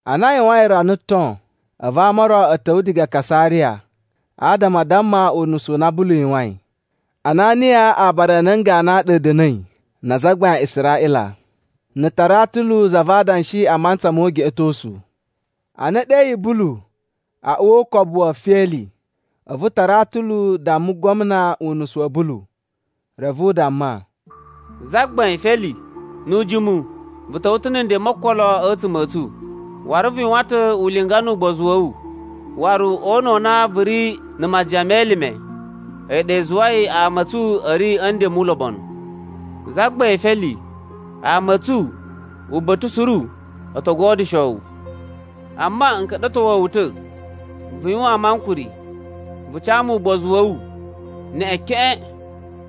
Ana a yuwain rana ton, a̱vu ama o ro a̱ ta̱wa̱ diga Kasariya adama a damma unusu u na Bulu yuwain. Ananiya aabara a nan ganu a ɗa a̱ da̱na̱i na azagbain a Israꞌila na̱ Taratulu za va adanshi a mantsa mo ugeꞌetosu. Ana e ɗeyi Bulu a uwa o ukobu wa̱ Feli, a̱vu Taratulu damma gwamna unusu wa̱ Bulu. Reve u damma, “Zagbain Feli, nu ujimu vu ta̱wa̱ ta̱ na̱ nden mo okolo a̱tsuma̱ a̱ tsu, waru vu yuwan ta̱ ulinga nu ugbozu wa̱ wu, waru o una̱ u na vu ri na̱ majiyan me elime, a̱yi ɗa i zuwai ama a̱ tsu a̱ ri a̱ nden mu ulobonu. Zagbain Feli, ama a̱ tsu uba̱ta̱ suru o to godyusho wu. Amma n ka̱ɗa̱towa̱ wu ta̱ vu yuwaan mu ankuri, vu ca mu ugbozu wa̱ wu neꞌen keꞌen,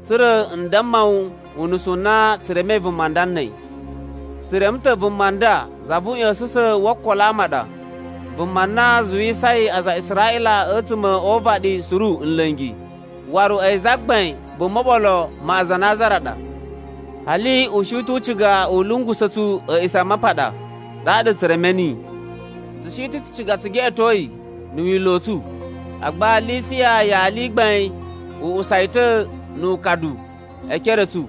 tsa̱ra̱ n damma wu unusu u na tsu remei vuma nda na̱ a̱yi. “Tsu reme ta̱ vuma nda za vu uꞌya̱sa̱sa̱n wo okolo wa ama a ɗa. Vuma na zuwusai aza a Israꞌila a̱tsuma̱ o uvaɗi suru nla̱ngi. Waru a̱yi zagbain vo moɓolo ma Aza a Nazara ɗa. Hali u shi ta̱ u ciga u lungusa̱ tsu A̱a̱ꞌisamapaɗa. Ɗaɗa tsu reme niyi. [ “Tsu shi ta̱ tsu ciga tsu geꞌeto yi na̱ Wila̱ u tsu. Agba Lisiya yali i gbain u usa yi ta̱ nu ukadu e ekere a̱ tsu.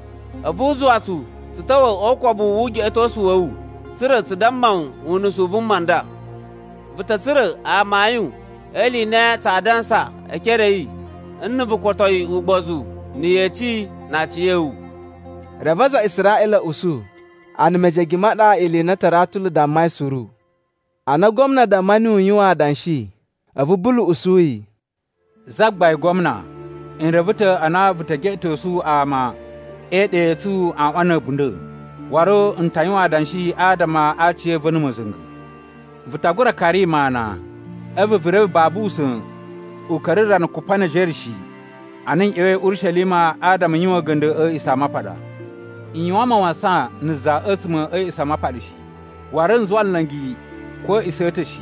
A̱vu u zuwa tsu tsu ta̱wa̱ o ukobu wu ugeꞌetosu wa̱ wu, tsa̱ra̱ tsu damma wu unusu u vuma u nda.] “Vu ta̱ tsura̱ amayun e ili i na tsaa dansa e ekere a̱ yi nna̱ vu koto yi ugbozu na̱ yeci na aciya̱wu.” Reve aza a Israꞌila a̱ usu, a na mejege ma ɗa ili i na Taratulu dammai suru. Ana gwamna damma niyi u yuwan adanshi, a̱vu Bulu usu yi, “Zagbain Gwamna, n reve ta̱ a na vu ta̱ geꞌetosu ama e iɗa i tsu aꞌwan na̱ a̱bunda̱. Waru n ta yuwan adanshi adama a aciya̱va̱ na̱ ma̱za̱nga̱. Vu ta gura kari mu ana, a̱vu vu reve babu usa̱n u ka̱ra̱ rana kupa ne ejere shi a na n ꞌya̱wa̱i Urishelima adama n yuwan a̱ga̱nda̱ a̱ A̱a̱ꞌisamapaɗa. N yuwan mawasan na̱ za a̱tsuma̱ a̱ A̱a̱ꞌisamapaɗa shi. Waru n zuwa nla̱ngi ko a̱ a̱a̱ꞌisa̱ a̱ ta̱ shi,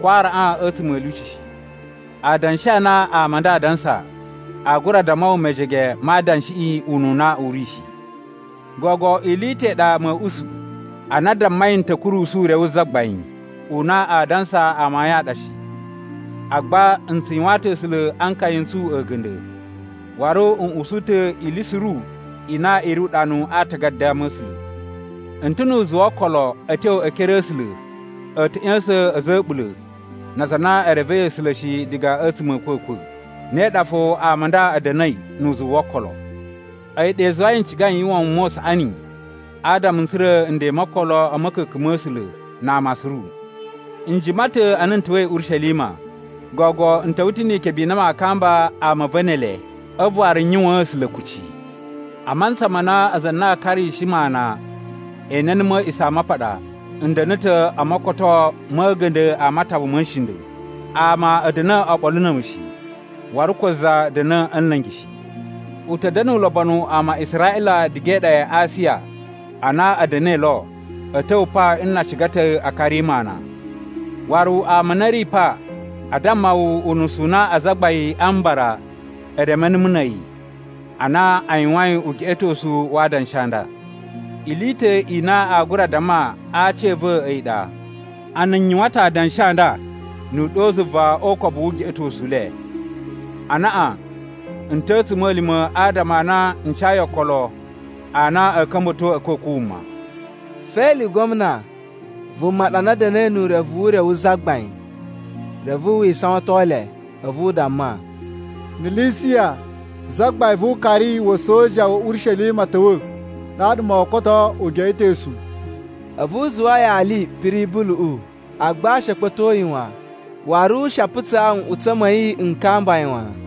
ko araꞌan a̱tsuma̱ a̱ lyuci shi. Adanshi a na ama a nda adansa aa gura damma wu mejege ma adanshiꞌi ununa u ri shi. “Gogo ili i ta̱ i ɗa ma̱a̱ usu, ana a dammai n ta̱ kurusu Ure wu Zagbain u na aa dansa amayun a ɗa shi. Agba n tsu yuwaan ta̱ A̱sula̱ a nkaya n tsu a̱ga̱nda̱, waru n usu ta̱ ili suru i na i ri uɗanu a atagada a Ama̱sula̱. N ta̱ nu uzuwu wo okolo a̱ tyo e ekere a̱ A̱sula̱ a̱ ta̱ ꞌya̱sa̱n a̱za̱ a̱ a̱ɓula̱ na aza a na e revei A̱sula̱ shi diga a̱tsuma̱ a̱ a̱a̱kwa̱kwa̱, ne ɗa fo ama a nda a̱ da̱na̱i nu uzuwu wo okolo. A̱yi ɗa i zuwai n cigai n yuwan wuma u saꞌani adama n tsura̱ nden mo okolo a̱ ma̱ka̱ka̱n ma̱ A̱sula̱ na ama suru. “N jima ta̱ ana n ta̱wa̱i Urishelima. Gogo, n ta̱wa̱ ta̱ ni ikebe i na maa kamba ama a̱ va̱ ne ele, a̱vu waru n yuwaan A̱sula̱ kucci. A mantsa ma na aza a na a karishi mu ana e ene numu a̱ A̱a̱ꞌisamapaɗa, n da̱na̱ ta̱ o mokotoo ma̱ a̱ga̱nda̱ a matawa ma̱ nshinda̱. Ama a̱ da̱na̱ oɓolo na̱ a̱mu shi, waru ko za da̱na̱ a̱ nla̱ngi shi. U ta̱ da̱na̱ ulobonu ama a Israꞌila diga e iɗa ya Asiya a na a̱ da̱na̱i lo a̱ ta̱wa̱ pa nna a ciga ta̱ a kari mu ana. Waru ama a na a̱ ri pa a damma wu unusu u na Azagbain a Mbara e reme numu na̱ a̱yi, ana a yuwain ugeꞌetosu wa adanshi a nda. Ili i ta̱ i na a gura damma a aci a̱ va̱ a̱yi ɗa, a na n yuwan ta̱ adanshi a nda nu uɗyo zuva o ukobu wu ugeꞌetosu u le, ‘Anaꞌan n ta̱ a̱ a̱tsuma̱lima̱ adama a na n cayi okolo a na a̱a̱ ka̱mba̱to a̱kwa̱kwa̱ wuma.’” Feli gwamna vuma ɗa na da̱na̱i nu urevu wu Ure wu Zagbain, reve wi isawaton le, a̱vu u damma, “Na̱ Lisiya zagbain vu ukari wa̱ a̱soja wa̱ Urishelima ta̱wa̱, ɗaɗa moo koto ugeꞌetosu.” A̱vu u zuwa yali piri Buluꞌu, agba she a kpa̱to yi wan. Waru she a putsaa nꞌutsa̱ ma̱ yi n kamba yi wan.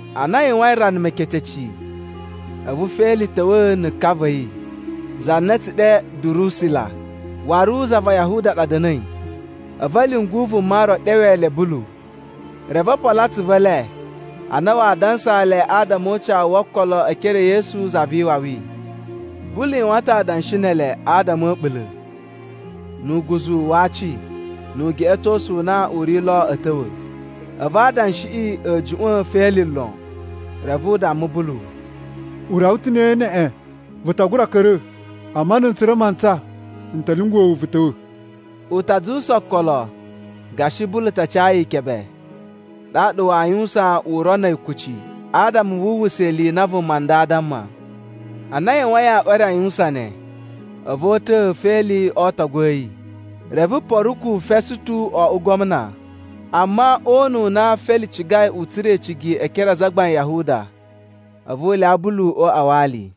Ana a yuwain rana meketeci, a̱vu Feli ta̱wa̱ na̱ ka va̱ yi. Za na a̱ tsu ɗe Durusila, waru za va Yahuda ɗa da̱na̱i. A̱vu a̱ lyungu vuma ro ɗewe le Bulu, reve o polo atsuvu e le ana waa dansaa le adama o ucawu wo okolo e ekere e Yesu Za vi Iwawi. Bulu yuwan ta̱ adanshi ne ele adama a̱ a̱ɓula̱, nu uguzu wa aci, nu ugeꞌetosu u na u ri lo a̱ ta̱wa̱, a̱vu adanshiꞌi a̱ juꞌwa̱n Feli lon. Reve u damma Bulu, “U rawa ta̱ ne neꞌen. Vu ta gura ka̱ra̱. Amma na̱ n tsura̱ mantsa, n ta̱ lyunguwa̱ wu vu ta̱wa̱.” U ta zuwusa okolo gashi Bulu ta ca yi ikebe, ɗaɗa waa yuwusan uro na̱ a̱yi kuci adama wu uwwusa ili i na vuma nda aa damma. Ana a yuwain aꞌwan e re a yuwusan ne, a̱vu o uta̱a̱ Feli o ootogu a̱ yi. Reve Poruku Fesutu wo oꞌwo gwamna. Amma o una̱ u na Feli cigai u tsura̱ icigi e ekere a azagbain a Yahuda, a̱vu u lyawa Bulu o uꞌwa wa ali.